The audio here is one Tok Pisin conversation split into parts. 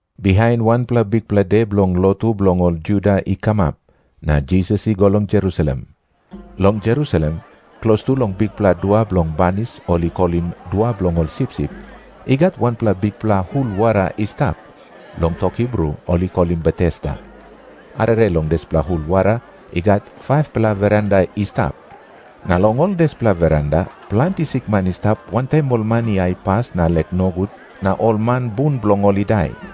Bihain wanpela bikpela de bilong lotu bilong ol Juda i kamap, na Jisas i go long Jerusalem. Long Jerusalem, klostu long bikpela dua bilong banis ol i kolim Dua Bilong Ol Sipsip, i gat wanpela bikpela hul wara i stap, long tok Hibru ol i kolim Betesda. Arere long dispela hul wara i gat 5-pela veranda i stap. Na long ol dispela veranda, planti sikman i stap, wantaim ol man i aipas na lek nogut, na ol man bun bilong ol i dai.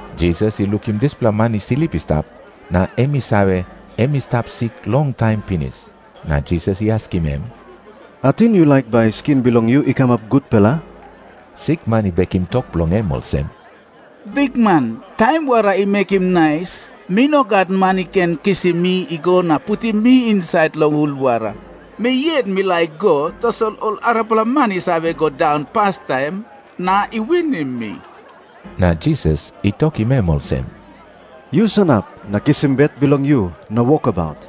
Jisas i lukim dispela man i slip i stap, na em i save, em i stap sik longtaim pinis. Na Jisas i askim em, “Ating yu laik bai skin bilong yu i kamap gutpela?” Sikman i bekim tok bilong em olsem, “Bikman, taim wara i mekim nais, mi no gat man i ken kisim mi i go na putim mi insait long hul wara. Mi yet mi laik i go, tasol ol arapela man i save go daun pastaim na i winim mi.” Na Jisas i tokim em olsem, “Yu sanap na kisim bet bilong yu na wokabaut.”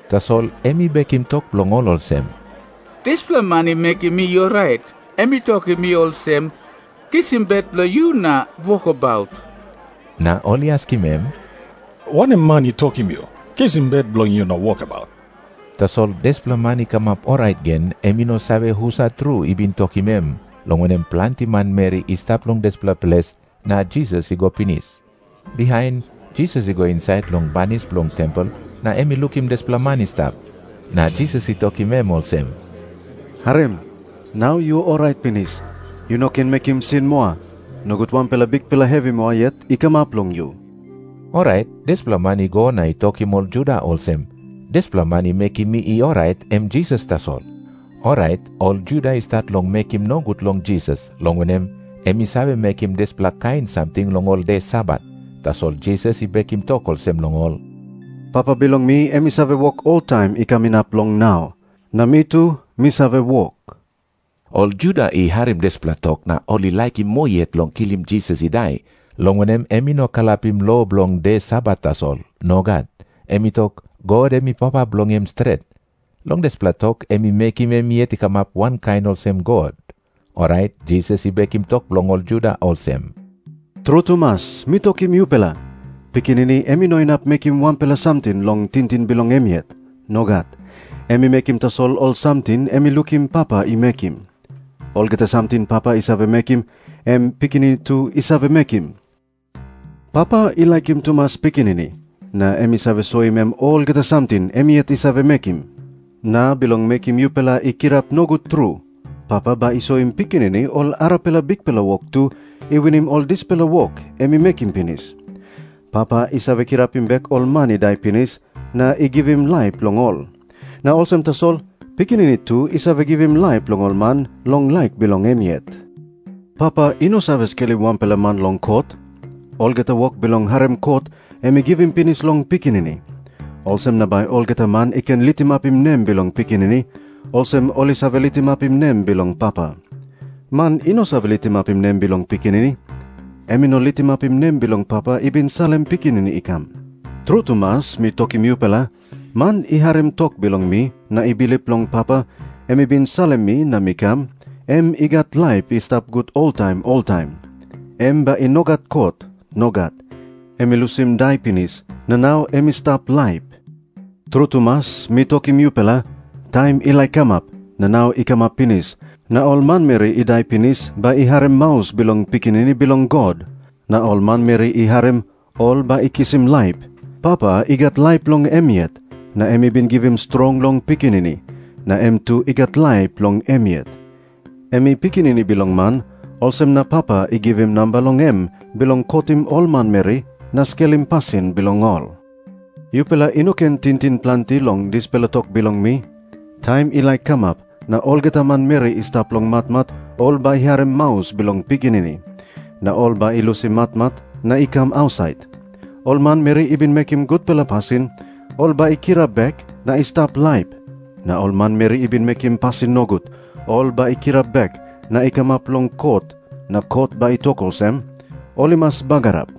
Tasol em i bekim tok bilong ol olsem, “Dispela man i mekim mi i orait, em i tokim mi olsem, ‘Kisim bet bilong yu na wokabaut.’” Na ol i askim em, “Wanem man i tokim yu, ‘Kisim bet bilong yu na wokabaut’?” Tasol dispela man i kamap orait gen em i no save husat tru i bin tokim em, long wanem, planti manmeri i stap long dispela ples, na Jisas i go pinis. Bihain Jisas i go insait long banis bilong tempel na em i lukim dispela man i stap. Na Jisas i tokim em olsem, “Harim. Nau yu orait pinis. Yu no ken mekim sin moa, nogut wanpela bikpela hevi moa yet i kamap long yu.” Orait dispela man i go na i tokim ol Juda olsem, “Dispela man i mekim mi i orait, em Jisas tasol.” Orait ol Juda i stat long mekim nogut long Jisas, long wanem, em i save mekim dispela kain samting long ol de Sabat. Tasol Jisas i bekim tok olsem long ol, “Papa bilong mi em i save wok oltaim i kam inap long nau. Na mi tu mi save wok.” Ol Juda i harim dispela tok na ol i laikim moa yet long kilim Jisas i dai, long wanem, em i no kalapim lo bilong de Sabat tasol. Nogat. Em i tok, God em i Papa bilong em stret. Long dispela tok em i mekim em yet i kamap wankain olsem God. Orait Jisas i bekim tok bilong ol Juda olsem, “Tru tumas mi tokim yupela, Pikinini em i no inap mekim wanpela samting long tingting bilong em yet. Nogat. Em i mekim tasol ol samting em i lukim Papa i mekim. Olgeta samting Papa i save mekim, em Pikinini tu i save mekim. Papa i laikim tumas Pikinini na em i save soim em olgeta samting em yet i save mekim. Na bilong mekim yupela i kirap nogut tru, Papa bai i soim Pikinini ol arapela bikpela wok tu, i winim ol dispela wok em i mekim pinis. Papa i save kirapim bek ol man i dai pinis na i givim laip long ol. Na olsem tasol Pikinini tu i save givim laip long ol man long laik bilong em yet. Papa i no save skelim wanpela man long kot. Olgeta wok bilong harim kot, em i givim pinis long Pikinini. Olsem na bai olgeta man i ken litimapim nem bilong Pikinini, olsem ol i save litimapim nem bilong Papa. Man i no save litimapim nem bilong Pikinini, em i no litimapim nem bilong Papa i bin salim Pikinini i kam. “Tru tumas mi tokim yupela, man i harim tok bilong mi, na i bilip long Papa, em i bin salim mi na mi kam, em i gat laip i stap gut oltaim oltaim. Em bai i no gat kot. Nogat. Em i lusim dai pinis, na nau em i stap laip. “Tru tumas mi tokim yupela, taim i laik kamap, na nau i kamap pinis, na ol manmeri i dai pinis bai i harim maus bilong Pikinini Bilong God. Na ol manmeri i harim, ol bai i kisim laip. Papa i gat laip long em yet. Na em i bin givim strong long Pikinini, na em tu i gat laip long em yet. Em i Pikinini Bilong Man, olsem na Papa i givim namba long em bilong kotim ol manmeri na skelim pasin bilong ol. Yupela i no ken tingting planti long dispela tok bilong mi. Taim i laik kamap na olgeta manmeri i stap long matmat ol bai i harim maus bilong Pikinini, na ol bai i lusim matmat na i kam ausait. Ol manmeri i bin mekim gutpela pasin, ol bai i kirap bek na i stap laip. Na ol manmeri i bin mekim pasin nogut, ol bai i kirap bek na i kamap long kot na kot bai i tok olsem, ol i mas bagarap.”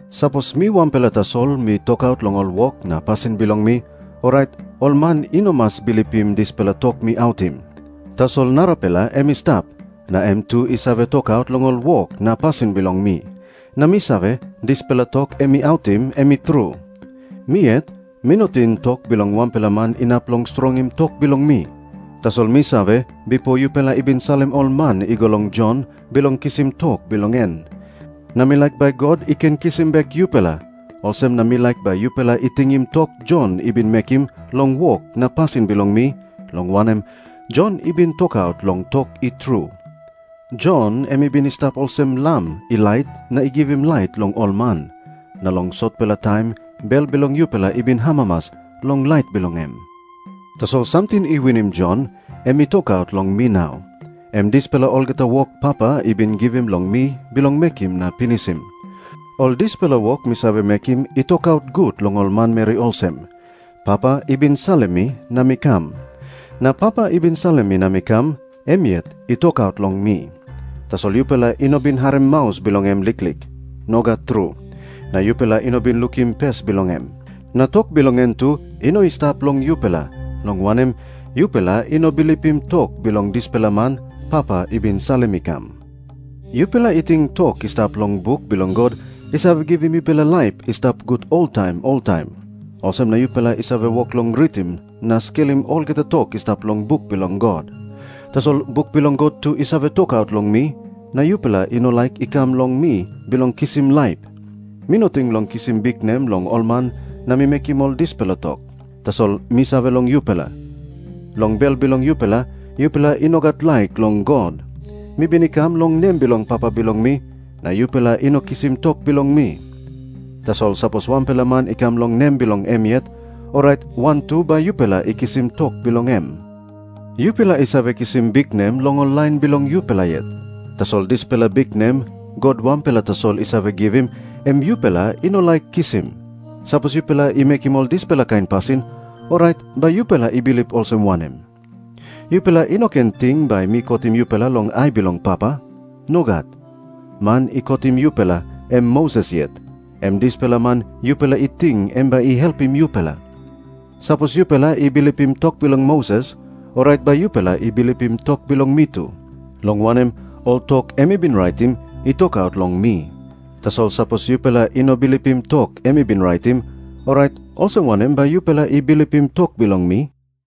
“Sapos mi wanpela tasol mi tokaut long ol wok na pasin bilong mi, orait ol man i no mas bilipim dispela tok mi autim. Tasol narapela em i stap, na em tu i save tokaut long ol wok na pasin bilong mi. Na mi save, dispela tok em i autim, em i tru. “Mi yet mi no ting tok bilong wanpela man inap long strongim tok bilong mi. Tasol mi save bipo yupela i bin salim ol man i go long Jon bilong kisim tok bilong en. Na mi laik bai God i ken kisim bek yupela, olsem na mi laik bai yupela i tingim tok Jon i bin mekim long wok na pasin bilong mi, long wanem, Jon i bin tokaut long tok i tru. Jon em i bin i stap olsem lam i lait na i givim lait long ol man. Na long sotpela taim bel bilong yupela i bin amamas long lait bilong em. “Tasol samting i winim Jon, em i tokaut long mi nau. Em dispela olgeta wok Papa i bin givim long mi bilong mekim na pinisim. Ol dispela wok mi save mekim i tokaut gut long ol manmeri olsem, Papa i bin salim mi na mi kam. Na Papa i bin salim mi na mi kam, em yet i tokaut long mi. Tasol yupela i no bin harim maus bilong em liklik. Nogat tru. Na yupela i no bin lukim pes bilong em. Na tok bilong em tu i no i stap long yupela, long wanem, yupela i no bilipim tok bilong dispela man Papa i bin salim i kam. “Yupela i ting tok i stap long buk bilong God i save givim yupela laip i stap gut oltaim oltaim. Olsem na yupela i save wok long ritim na skelim olgeta tok i stap long buk bilong God. Tasol buk bilong God tu i save tokaut long mi, na yupela i no laik i kam long mi bilong kisim laip. “Mi no ting long kisim biknem long ol man na mi mekim ol dispela tok. Tasol mi save long yupela. Long bel bilong yupela, yupela i no gat laik long God. Mi bin i kam long nem bilong Papa bilong mi, na yupela i no kisim tok bilong mi. Tasol sapos wanpela man i kam long nem bilong em yet, orait wantu bai yupela i kisim tok bilong em. Yupela i save kisim biknem long ol lain bilong yupela yet. Tasol dispela biknem God wanpela tasol i save givim, em yupela i no laik kisim. Sapos yupela i mekim ol dispela kain pasin, orait bai yupela i bilip olsem wanem? “Yupela i no ken ting bai mi kotim yupela long ai bilong Papa. Nogat. Man i kotim yupela em Moses yet, em dispela man yupela i ting em bai i helpim yupela. Sapos yupela i bilipim tok bilong Moses, orait bai yupela i bilipim tok bilong mi tu, long wanem, ol tok em i bin raitim i tokaut long mi. Tasol sapos yupela i no bilipim tok em i bin raitim, orait olsem wanem bai yupela i bilipim tok bilong mi?”